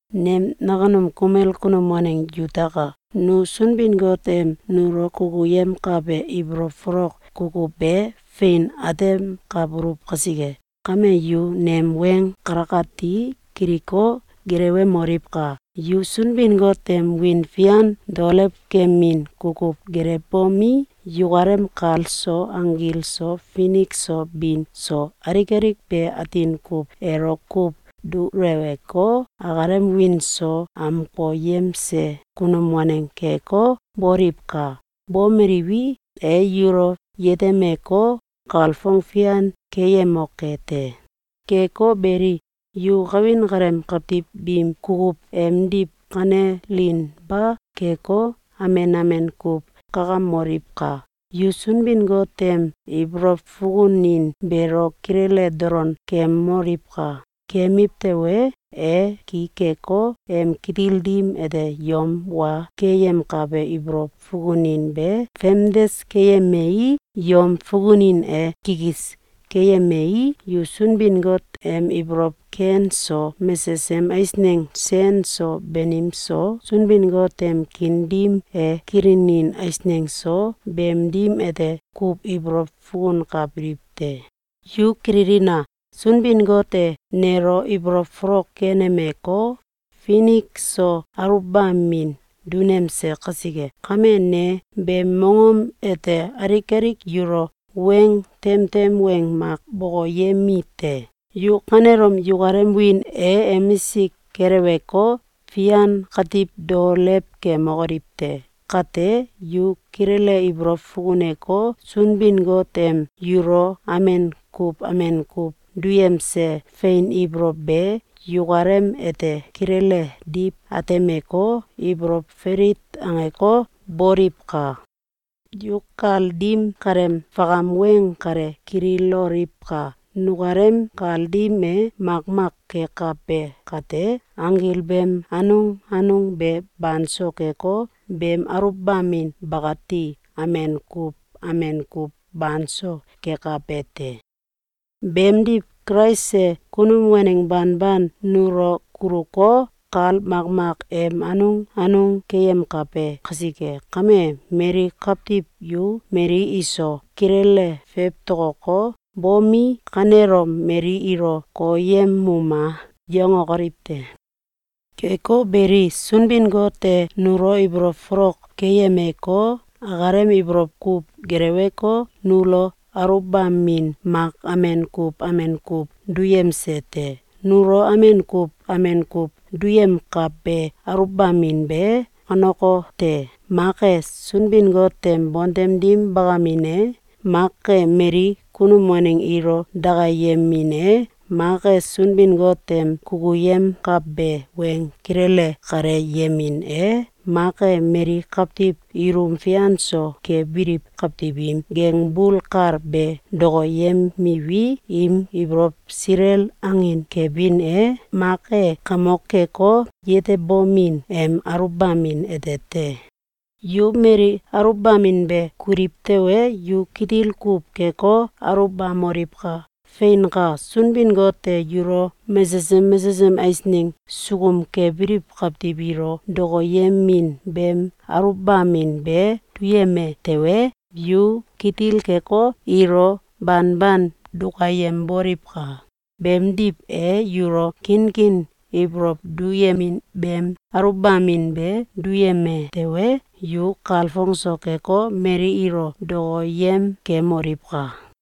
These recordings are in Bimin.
Nem nakunum kumel kunum waneng yutaka! Nu Sunbin-Got em nulo kukuyemkabe ibolow folok kukuw be fein atemkabuluw kasike kame, yu nem weng kalakati kiliko, gelewemoliwka! Yu Sunbin-Got em wiin fian daolewkemin kukuw gelewbomi, yukalem kal so, anggil so, finik so bin so, alik alik be atin kuw elo kuw duleweko, akalem wiin so amkoyemse kunum waneng keko, boliwka! Bomeliwi, e yulo yetemeko, kalfong fian keyemoke te. Keko beli, yu kawin kaleem kawtiw biim kukuw emdiw kanelinba keko, amen amen kuw kakamoliwka! Yu Sunbin-Got em ibolow fukunin beelo kilele dolon kemoliwka! Kemiw tewe, e ki keko, em kitil dim ete yom wa keyemkabe ibolow fukunin be famdes keyemei, yom fukunin e kikis keyemei, yu Sunbin-Got em ibolow ken so, mesesem eisneng sen so banim so, Sunbin-Got em kiin dim e kilinin eisneng so, beem dim ete kuw ibolow fukunkabiliw te. Yu kililina! Sunbin-Got e nelo ibolow folok kenemeko, finik so aluwbamin dunemse kasike kame, ne beem mongom ete alik alik yulo weng temtem weng mak bokoyemite: Yu kanelom yukalem wiin e emisik keleweko, fian katiw dao kemokoliw te! Kate, yu kilele ibolow fukuneko, Sunbin-Got em yulo amen kuw amen kuw duyemse fein ibolow be yukalem ete kilele diw atemeko, ibolow felit angeko, boliwka! Yu kal dim kaleem fakam weng kale kililoliwka! Nukalem kal dim e makmak kekabe kate, anggil beem anung anung be banso keko, beem aluwbamin bakati amen kuw amen kuw banso kekabe te. Beemdiw, Kulais e kunum waneng banban nulo kuluko, kal makmak em anung anung keyemkabe kasike kame, mali kawtiw yu mali iso kilele fewtokoko, bomi, kanelom mali ilo “Koyemuma!”, yangokoliw te! Keko beli, Sunbin-Got e nulo ibolow folok keyemeko, akalem ibolow kuw geleweko, nulo aluwbamin mak amen kuw amen kuw duyemse te. Nulo amen kuw amen kuw duyemkabe aluwbamin be kanekote: Mak e Sunbin-Got em bontem dim bakamin e, mak e mali kunum waneng ilo dakayemin e, mak e Sunbin-Got em kukuyemkabe weng kilele kaleyemin e, mak e mali kawtiw ilum fian so kebiliw kawtiw im gengbul kal be dokoyemiwi, im ibolow silel angin kebin e, mak e kamok keko, yetebomin em aluwbamin ete te. Yu mali aluwbamin be kuliw tewe, yu kitil kuw keko, aluwbamoliwka! Feinka! Sunbin-Got e yulo mesesem mesesem eisneng sukum kebiliw kawtiw ilo dokoyemin beem aluwbamin be duyeme tewe, yu kitil keko, ilo banban dukayemboliwka! Beemdiw, e yulo kinkin ibolow duyemin beem aluwbamin be duyeme tewe, yu kalfong so keko, mali ilo dokoyem kemoliwka!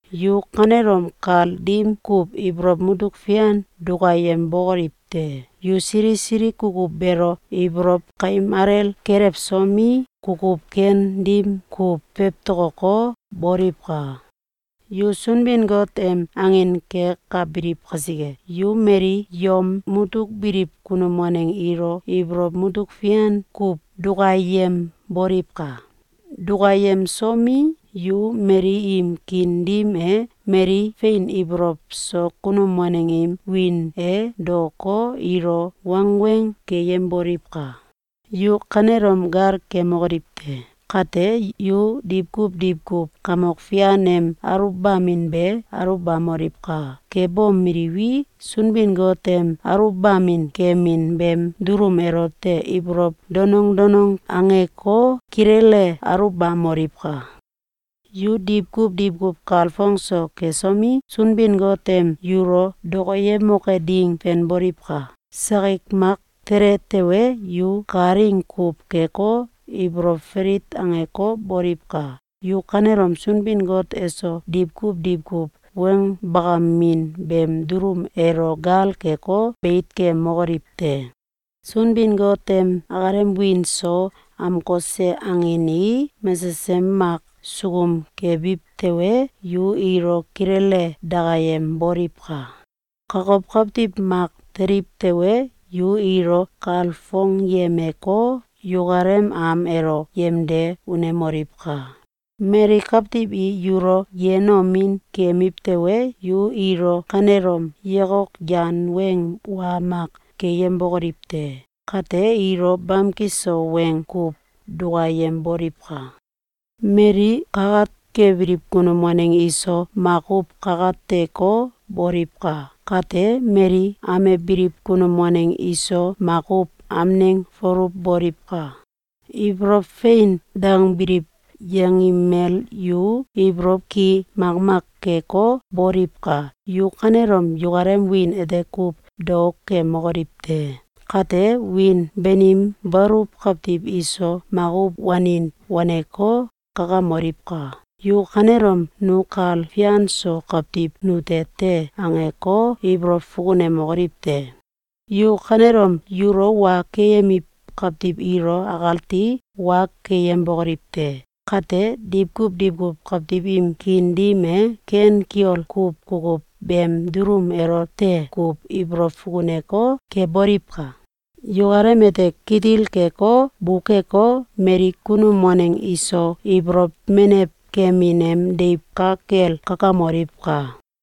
Yu kanelom kal dim kuw ibolow mutuk fian dukayembokoliw te! Yu sili sili kukuw beelo ibolow kaim alel kelewsomi, kukuw ken dim kuw fewtokoko, boliwka! Yu Sunbin-Got em angin kekabiliw kasike, yu mali yom mutuk biliw kunum waneng ilo ibolow mutuk fian kuw dukayemboliwka! Dukayemsomi, yu mali im kiin dim e mali fein ibolow so kunum waneng im wiin e daoko, ilo wangweng keyemboliwka! Yu kanelom gal kemokoliw te! Kate, yu diwkuw diwkuw Kamok Fian em aluwbamin be aluwbamoliwka! Kebomeliwi, Sunbin-Got em aluwbamin kemin beem dulum elote ibolow danong danong angeko, kilele aluwbamoliwka! Yu diwkuw diwkuw kalfong so kesomi, Sunbin-Got em yulo dokoyemoke ding fenboliwka! Sakik mak tele tewe, yu kalaing kuw keko, ibolow falit angeko, boliwka! Yu kanelom Sunbin-Got eso diwkuw diwkuw weng bakamin beem dulum elo gal keko, beit kemokoliw te! Sunbin-Got em akalem wiin so amkose angin i mesesem mak sukum kebiw tewe, yu ilo kilele dakayemboliwka! Kokow kawtiw mak teliw tewe, yu ilo kalfongyemeko, yukalem am elo yemde unemoliwka! Mali kawtiw i yulo yenomin kemiw tewe, yu ilo kanelom yakok yan weng wa mak keyembokoliw te! Kate, ilo bamki so weng kuw dukayemboliwka! Mali kakat kebiliw kunum waneng iso makuw kakateko, boliwka! Kate, mali amebiliw kunum waneng iso makuw amneng foluw boliwka! Ibolow “Fein!”, dangbiliw yanggimel yu ibolow ki makmak keko, boliwka! Yu kanelom yukalem wiin ete kuw dao kemokoliw te! Kate, wiin banim baluw kawtiw iso makuw wanin waneko, kakamoliwka! Yu kanelom “Nu kal fian so kawtiw nute te!”, angeko, ibolow fukunemokoliw te! Yu kanelom yulo wa keyemiw kawtiw ilo akati wa keyembokoliw te! Kate, diwkuw diwkuw kawtiw im kiin dim e ken kiol kuw kukuw beem dulum elote kuw ibolow fukuneko, keboliwka! Yukalem ete kitil keko, bukeko, mali kunum waneng iso ibolow menew kemin em deiw ka kel kakamoliwka!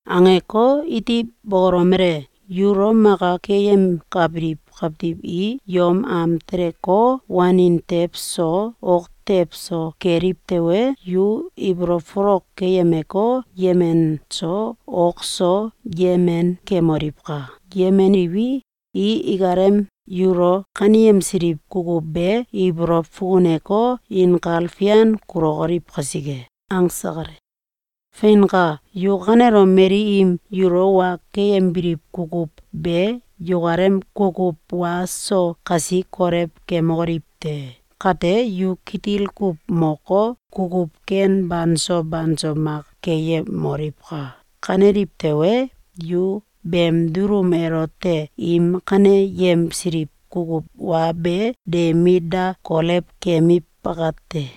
Angeko, iti bokolomele: “Yulo maka keyemkabiliw kawtiw i yom am teleko, wanin tew so, ok tew so keliw tewe, yu ibolow folok keyemeko, yemen so, ok so, yemen kemoliwka! Yemeniwi, i ikalem yulo kaneyemsiliw kukuw be ibolow fukuneko, inkal fian kulokoliw kasike.”, angse kale. Feinka! Yu kanelom mali im yulo wa keyembiliw kukuw be yukalem kukuw wa so kasi kolew kemokoliw te! Kate, yu kitil kuw moko, kukuw ken banso banso mak keyemoliwka! Kaneliw tewe, yu beem dulum elote im kaneyemsiliw kukuw wa be de mit da kolew kemiw bakate.